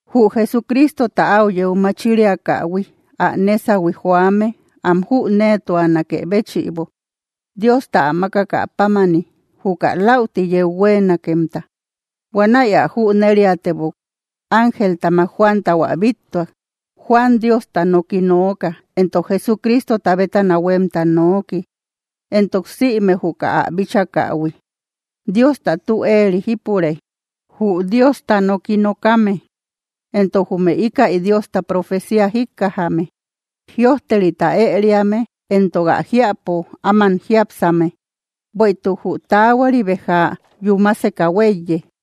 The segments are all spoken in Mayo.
Jü Jesucristota áu yeu machiriakähui, ä nésahui joame am jüneetuanakë béchïbo, Diosta ä mákakä pámani, juka läuti yeu huéenakemta. Huanäi ä jüneriatebok, ángeltamak Juantau ä bíttuak. Juan Diosta noki nooka, entok Jesucristota bétana huemta nooki, entok sïme juka ä bíchakähui. Diosta tü éeri jípure, jü Diosta noki nokame, entok jume ikäi Diosta profecía jíkkajame, jïojterita ëriame entok ä jiäpo áman jiápsame. Bueïtuk jü taahuari béja yúmaseka huéiye.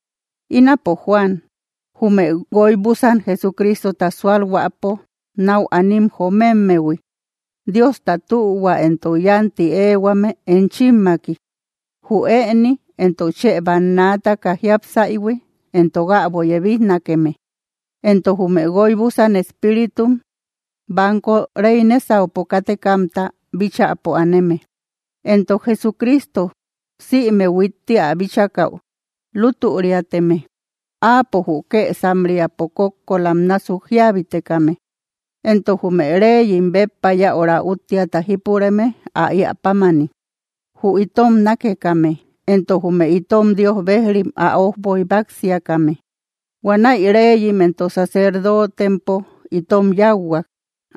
Ínapo, Juan jume guóy búsan Jesucristota sualhuäpo nau anim joomemmehui. Diosta tühua entok yánti éehuame enchimmaki, jü ëni, entok chë bannaataka jiápsaïhui, entok äbo yebijnakeme, entok jume guóy búsan espíritum banko rey nésaupo kátekamta bíchäpo aneme, entok Jesucristo, sïme huitti ä bíchakäu lútüriateme. Áapo jü kësam‑riapo kókkolam násuk jíabitekame, entok jume reyim béppa yäura úttiata jípureme ä iä pámani, jü itom nákekame entok jume itom Dios bejrim ä ójboy báksiakame. Huanäi reyim entok sacerdootempo itom yáuhuak,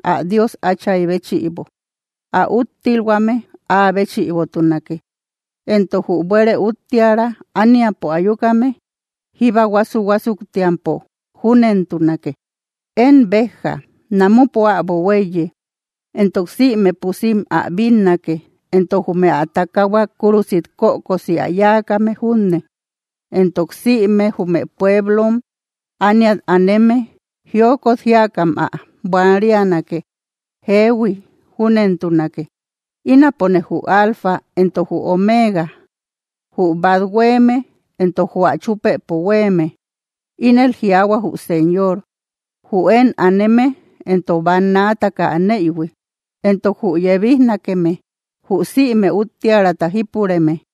ä Dios Áchay béchïbo. Ä úttilhuame áa béchïbotunake, entok jü buere úttiära ániapo ayukame, jíba huásu‑huásuktiampo. Júnentunake. ¡Én beja, namupo äbo huéiye! Entok sïme pusim ä bínnake, entok jume ä takahua kúrusit kökosi ä yáakame junne. Entok sïme jume pueblom ániat aneme jiokot jíakam ä buanrianake. Jeehui, júnentunake. “Ínapone jü Alfa entok jü Omega, jü bat huéeme, entok jü ä chupëpo huéeme”, ínel jiaahua jü Señor, jü én aneme entok bannaataka aneïhui, entok jü yebijnakeme, jü sïme úttiärata jípureme.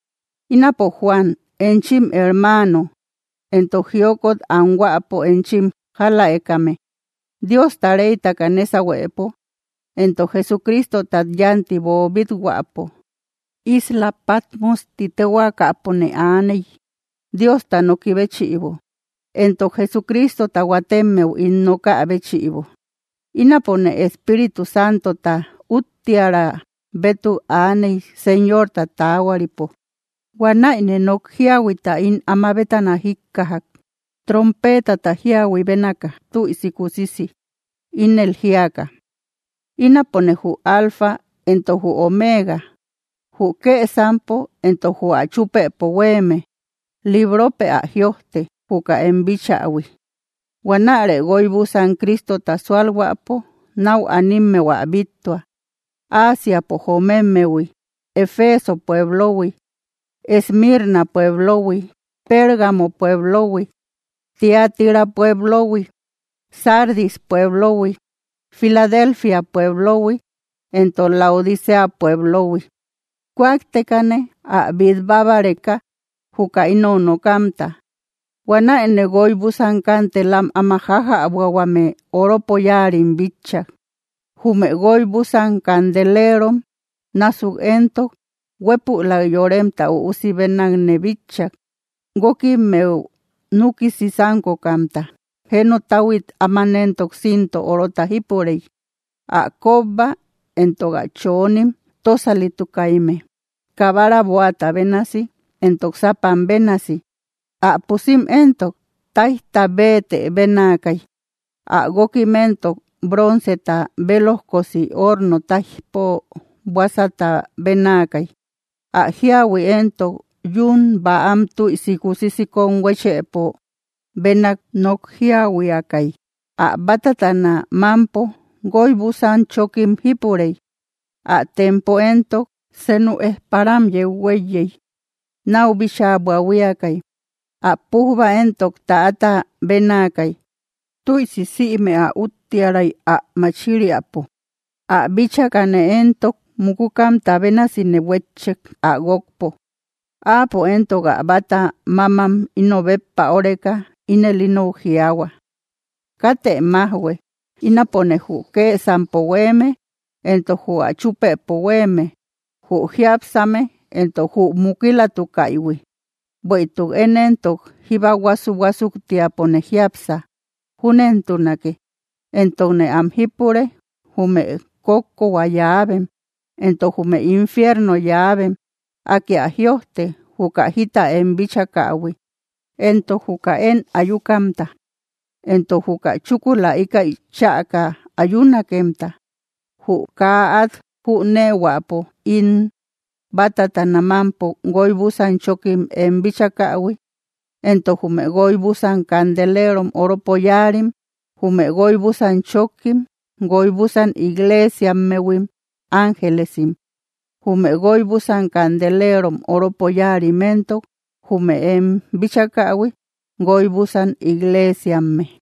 Ínapo Juan enchim hermaano entok jiokot anhuäpo enchim jáläekame, Diosta reytaka nésahuepo entok Jesucristotat yanti boobít-huäpo. Isla Patmos ti téhuaakapone aaney, Diosta noki béchïbo, entok Jesucristota huatemmeu ín nokä béchïbo. Ínapone Espíritu Santota úttiära bétuk aaney Señorta taahuaripo. Huanäine nok jíahuita ín ama bétana jikkajak, trompeetata jíahui bénaka, tüisi kusisi, ínel jíaka: —Ínapone jü Alfa éntok jü Omeega, jü kësampo entok jü ä chúpëpo huéeme. Libropë ä jïojte, juka em bíchähui. Huanärë guóy búsan Cristota sualhuäpo nau animmeu ä bíttua, Ásiapo jomemmehui: Efeso pueblohui, Esmirna pueblohui, Pérgamo pueblohui, Tiatira pueblohui, Sardis pueblohui, Filadelfia pueblohui, entok Laodicea pueblohui. Kúaktekane, ä bít bábareka, juka inou nokamta. Huanäine guóy búsan kanteelam áma jájäbuahuame oropo yáarim bitchak. Jume guóy búsan candelerom násuk éntok, huépülak Yoremta Üusi bénakne bitchak, guókimmeu núkisi sánkokamta. Jenotahuit áman éntok cinto orota jípurey. Ä kóbba entok ä choonim, tósalitukaimme, kabara bóata bénasi, entok sápam bénasi. Ä pusim éntok, táijta béetë benaakay. Ä guókim éntok, bronceta bélojkosi horno táijpo buásata bénaakay; ä jíahui éntok, yún bäam tüisi kusisi kón huéchëpo benak nok jíahuiakay. Ä bátatana mámpo guóy búsan chókim jípurey. Ä tempo éntok, senu ejparam yeu huéiyey, náu bíchaa buahuiakay. Ä pujba éntok, täata bénaakay, tüisi sïme ä úttiäray ä machiriapo. Ä bíchakane éntok mukukamta bénasine huétchek, ä guókpo. Áapo éntok ä báta mámam ino béppa óreka, ínel inou jiaahua: —Katë májhue. Ínapone jü kësampo huéeme entok jü ä chúpëpo huéeme, jü jiápsame entok jü mukilatukaïhui. Bueïtuk én éntok, jíba huásu‑huásuktiapone jiápsa. Júnentunake. Entokne am jípure, jume kókkohua llaavem, entok jume infierno llaavem. Akë ä jïojte, juka jita em bíchakähui, entok juka én ayukamta, entok juka chúkula ikäi chäka ayunakemta. Jü kaa át jüneehuäpo ín bátatana mámpo guoy búsan chókkim em bíchakähui, entok jume guóy búsan candelerom oropo yáarim: Jume guóy búsan chókkim, guoy búsan iglesiammehuim ángelesim; jume guoy búsan candelerom oropo yáarim éntok, jume em bíchakähui, guoy búsan iglesiamme.